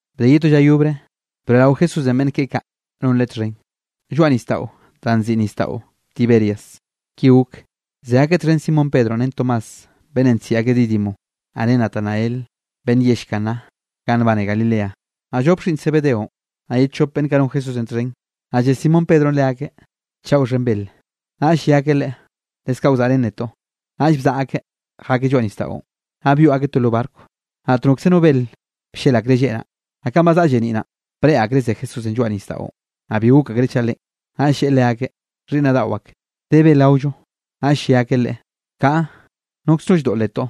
Bde ye to lla yobre, broeꞌrao Jesúsenꞌ beꞌnn keꞌe kaꞌ non Leꞌe txhen, lloaꞌ nisdaꞌo danꞌ nziꞌi Nisdaꞌo Tiberias, ki gok: Ze akeꞌ txhen Simón Pedronꞌ ren Tomás beꞌnnenꞌ nsiꞌi akeꞌ Dídimo, naꞌ ren Natanael beꞌnn yell Caná ganꞌ nbane Galilea, naꞌ llop xhiꞌnn Zebedeonꞌ, naꞌ ye chop beꞌnn kaꞌ non Jesúsenꞌ txhen. Naꞌ lle Simón Pedronꞌ leakeꞌ: —Chaꞌa wxhen bel. Naꞌll lle akeꞌ leꞌe: —Leskaꞌ wzaꞌrén netoꞌ. Naꞌll bzaꞌa akeꞌ jakeꞌ lloaꞌ nisdaꞌon, naꞌ byoꞌ akeꞌ to lo barco. Naꞌt nokze no bel bllel akreꞌ lleꞌ naꞌ. Naꞌ kanꞌ ba zaꞌa lleniꞌ naꞌn, breꞌe akreꞌ ze Jesúsenꞌ lloaꞌ nisdaꞌon, naꞌ bi gok akreꞌ chaꞌ Leꞌen. Naꞌll lleꞌe leakeꞌ: —Xhiꞌnnaꞌ daꞌo ak, ¿de bel gaollo? Naꞌll lle akeꞌ Leꞌe: —Kaꞌa, nokz no lldoꞌletoꞌ.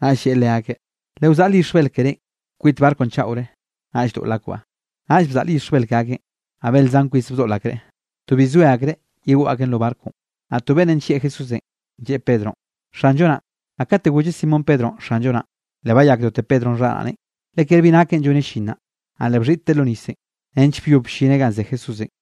Naꞌll lleꞌe leakeꞌ: —Lewzaꞌl yixj bel kerénꞌ kwit barconꞌ chaꞌore, naꞌll doꞌl akbaꞌ. Naꞌll bzaꞌl yixj bel ke akeꞌn. Naꞌ bel zan kwis bdoꞌl akreꞌ, to bi zoe akreꞌ yegoꞌ akeꞌn lo barconꞌ. Naꞌ to beꞌnnenꞌ nllieꞌ Jesúsenꞌ, lleꞌe Pedronꞌ: —Xanllo naꞌn. Naꞌ kate golleꞌ Simón Pedronꞌ, Xanllo naꞌn, le bayakdote Pedro xharaꞌneꞌn, le kere bi nakeꞌn lloneꞌ llin naꞌ, naꞌ le bxhiꞌtteꞌ lo nisenꞌ, nench byob bllineꞌ ganꞌ ze Jesúsenꞌ.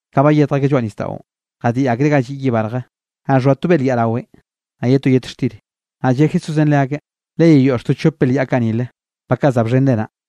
Ka bayetj akeꞌ lloaꞌ nisdaꞌon, jadiꞌ akreꞌ ga lliꞌ yiꞌ barje, naꞌ xhoa to belyaꞌ rawenꞌ, naꞌ ye to yet xtir. Naꞌ lle Jesúsenꞌ leakeꞌ: —Leyeyoꞌx to chop belyaꞌ kaꞌ nile, ba kaꞌ za bxhenre naꞌ.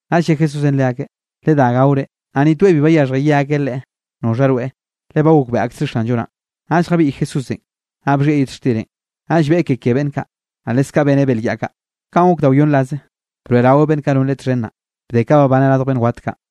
Naꞌll lle Jesúsenꞌ leakeꞌ: —Ledá gaore. Naꞌ ni toeꞌ bi bayaxhje, ye akeꞌ Leꞌe: “¿Noxha rweꞌ?”, le ba gokbeꞌe aksreꞌ Xanllo naꞌn. Naꞌll jabiꞌy Jesúsenꞌ, naꞌ bxhieꞌ yet xtirenꞌ, naꞌll beꞌe ke ke beꞌnn kaꞌ, naꞌ leskaꞌ beneꞌ belyaꞌ kaꞌ. Kanꞌ gok da wyonn rase, broeꞌraweꞌ beꞌnn kaꞌ non Leꞌe txhen naꞌ, bde ka nak babaneꞌ radj beꞌnn wat kaꞌ.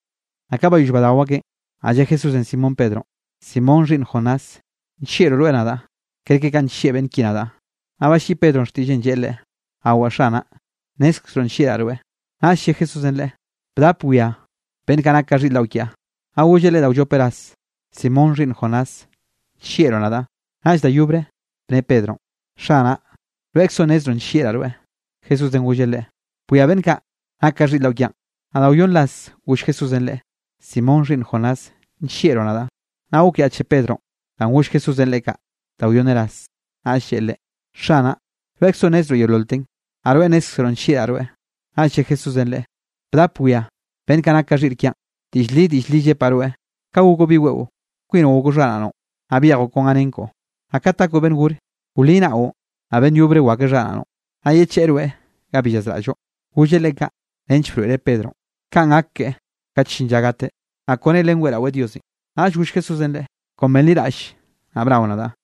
Naꞌ ka bayoll badao akeꞌn, naꞌ lle Jesúsenꞌ Simón Pedronꞌ: —Simón xhiꞌnn Jonás, ¿nllieꞌllroꞌ rweꞌ nadaꞌ, kerke kanꞌ nllieꞌ beꞌnn ki nadaꞌ? Naꞌ balliꞌi Pedronꞌ xtiꞌlleꞌn, lleꞌe Leꞌe: —Awaꞌ Xanaꞌ, nnezkzroꞌ nllieꞌraꞌ rweꞌ. Naꞌll lle Jesúsenꞌ leꞌe: —Bdap bwia beꞌnn kaꞌ nak ka xhiꞌr daꞌo kiaꞌ. Naꞌ golleꞌ leꞌe da wllop ras: —Simón xhiꞌnn Jonás, ¿nllieꞌroꞌ nadaꞌ? Naꞌll da yobre bne Pedronꞌ: —Xanaꞌ, rweꞌkzoꞌ nnezroꞌ nllieꞌraꞌ rweꞌ. Jesúsenꞌ golleꞌ leꞌe: —Bwia beꞌnn kaꞌ nak ka xhiꞌr daꞌo kiaꞌn. Naꞌ da wyonn ras goll Jesúsenꞌ Leꞌe: —Simón xhiꞌnn Jonás, ¿nllieꞌroꞌ nadaꞌ? Naꞌ gokyaꞌche Pedronꞌ danꞌ goll Jesúsenꞌ leꞌe kaꞌ da wyonne ras, naꞌll lleꞌe Leꞌe: —Xanaꞌ, rweꞌkzoꞌ nnezroꞌ yeololten, naꞌ rweꞌ nnézkzeroꞌ nllieꞌraꞌ rweꞌ. Naꞌll lle Jesúsenꞌ leꞌe: —Bdap bwia beꞌnn kaꞌ nak ka xhiꞌr kiaꞌn. Diꞌll li, diꞌll li llepaꞌ rweꞌ: Ka gokoꞌ bi weꞌo, kwinoꞌ gokoꞌ xharaꞌnoꞌn, naꞌ byejoꞌ kon ga nen koꞌo. Naꞌ kat gakoꞌ beꞌnn gore, wli naꞌon, naꞌ beꞌnn yobre wakweꞌ xharaꞌnoꞌn, naꞌ yecheꞌe rweꞌ ga bi llazraꞌlloꞌ. Golleꞌ leꞌe kaꞌ nench broeꞌreꞌ Pedronꞌ, kanꞌ gak keꞌe kat llin lla gateꞌ, naꞌ kone len weꞌraweꞌ Diosenꞌ. Naꞌll goll Jesúsenꞌ leꞌe: —Kon benliraꞌll, naꞌ bnao nadaꞌ.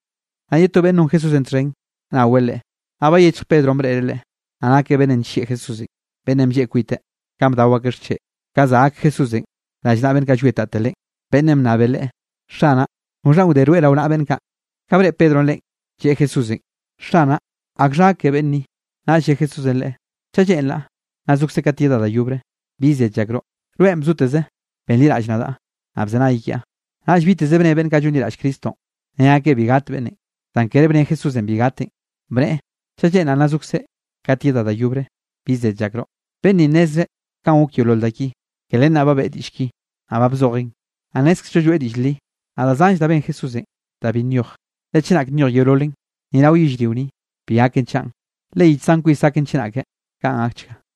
Naꞌ ye to beꞌnn non Jesúsenꞌ txhen naweꞌ leakeꞌ. Naꞌ bayechj Pedronꞌ breꞌreꞌ leꞌe. Naꞌ nakeꞌ beꞌnnenꞌ nllieꞌ Jesúsenꞌ, beꞌnnenꞌ blleꞌ kwiteꞌ, kanꞌ bdao akeꞌ xcheꞌ, ka za gak Jesúsenꞌ rallnaꞌa beꞌnn kaꞌ llwietate Leꞌen, beꞌnnenꞌ bnnabeꞌ Leꞌe: “Xanaꞌ, ¿noxhanꞌ wde rweꞌ rao naꞌa beꞌnn kaꞌ?” Ka breꞌe Pedronꞌ leꞌen, lleꞌe Jesúsenꞌ: —Xanaꞌ, ¿akxha gak ke beꞌnn ni? Naꞌll lle Jesúsenꞌ leꞌe: —Chaꞌ lleꞌnraꞌ nna zokzeꞌ kat yedaꞌ da yobre, ¿bi zed llakroꞌ? Rweꞌn bzoteze benliraꞌll nadaꞌ, naꞌ bzenay kiaꞌ. Naꞌll biteze bne beꞌnn kaꞌ llonliraꞌll Cristonꞌ, ne akeꞌ bi gat beꞌnnenꞌ. Zan kere bne Jesúsenꞌ bi gateꞌn, bneꞌe: “Chaꞌ lleꞌnraꞌ nna zokzeꞌ kat yedaꞌ da yobre, ¿bi zed llakroꞌ?” Beꞌnn ninꞌ nnezreꞌ kanꞌ gok yeolol da ki, ke len naꞌ ba beꞌe diꞌll ki, naꞌ ba bzojeꞌn. Naꞌ nnézkzello lloeꞌ diꞌll li. Naꞌ da zanll da ben Jesúsenꞌ da bi nyoj, le chenak nyoj yeololen, ni rao yellrio ni, bi gaken chaꞌn, le yich zan kwis gaken chenake. Kaꞌn gakchga.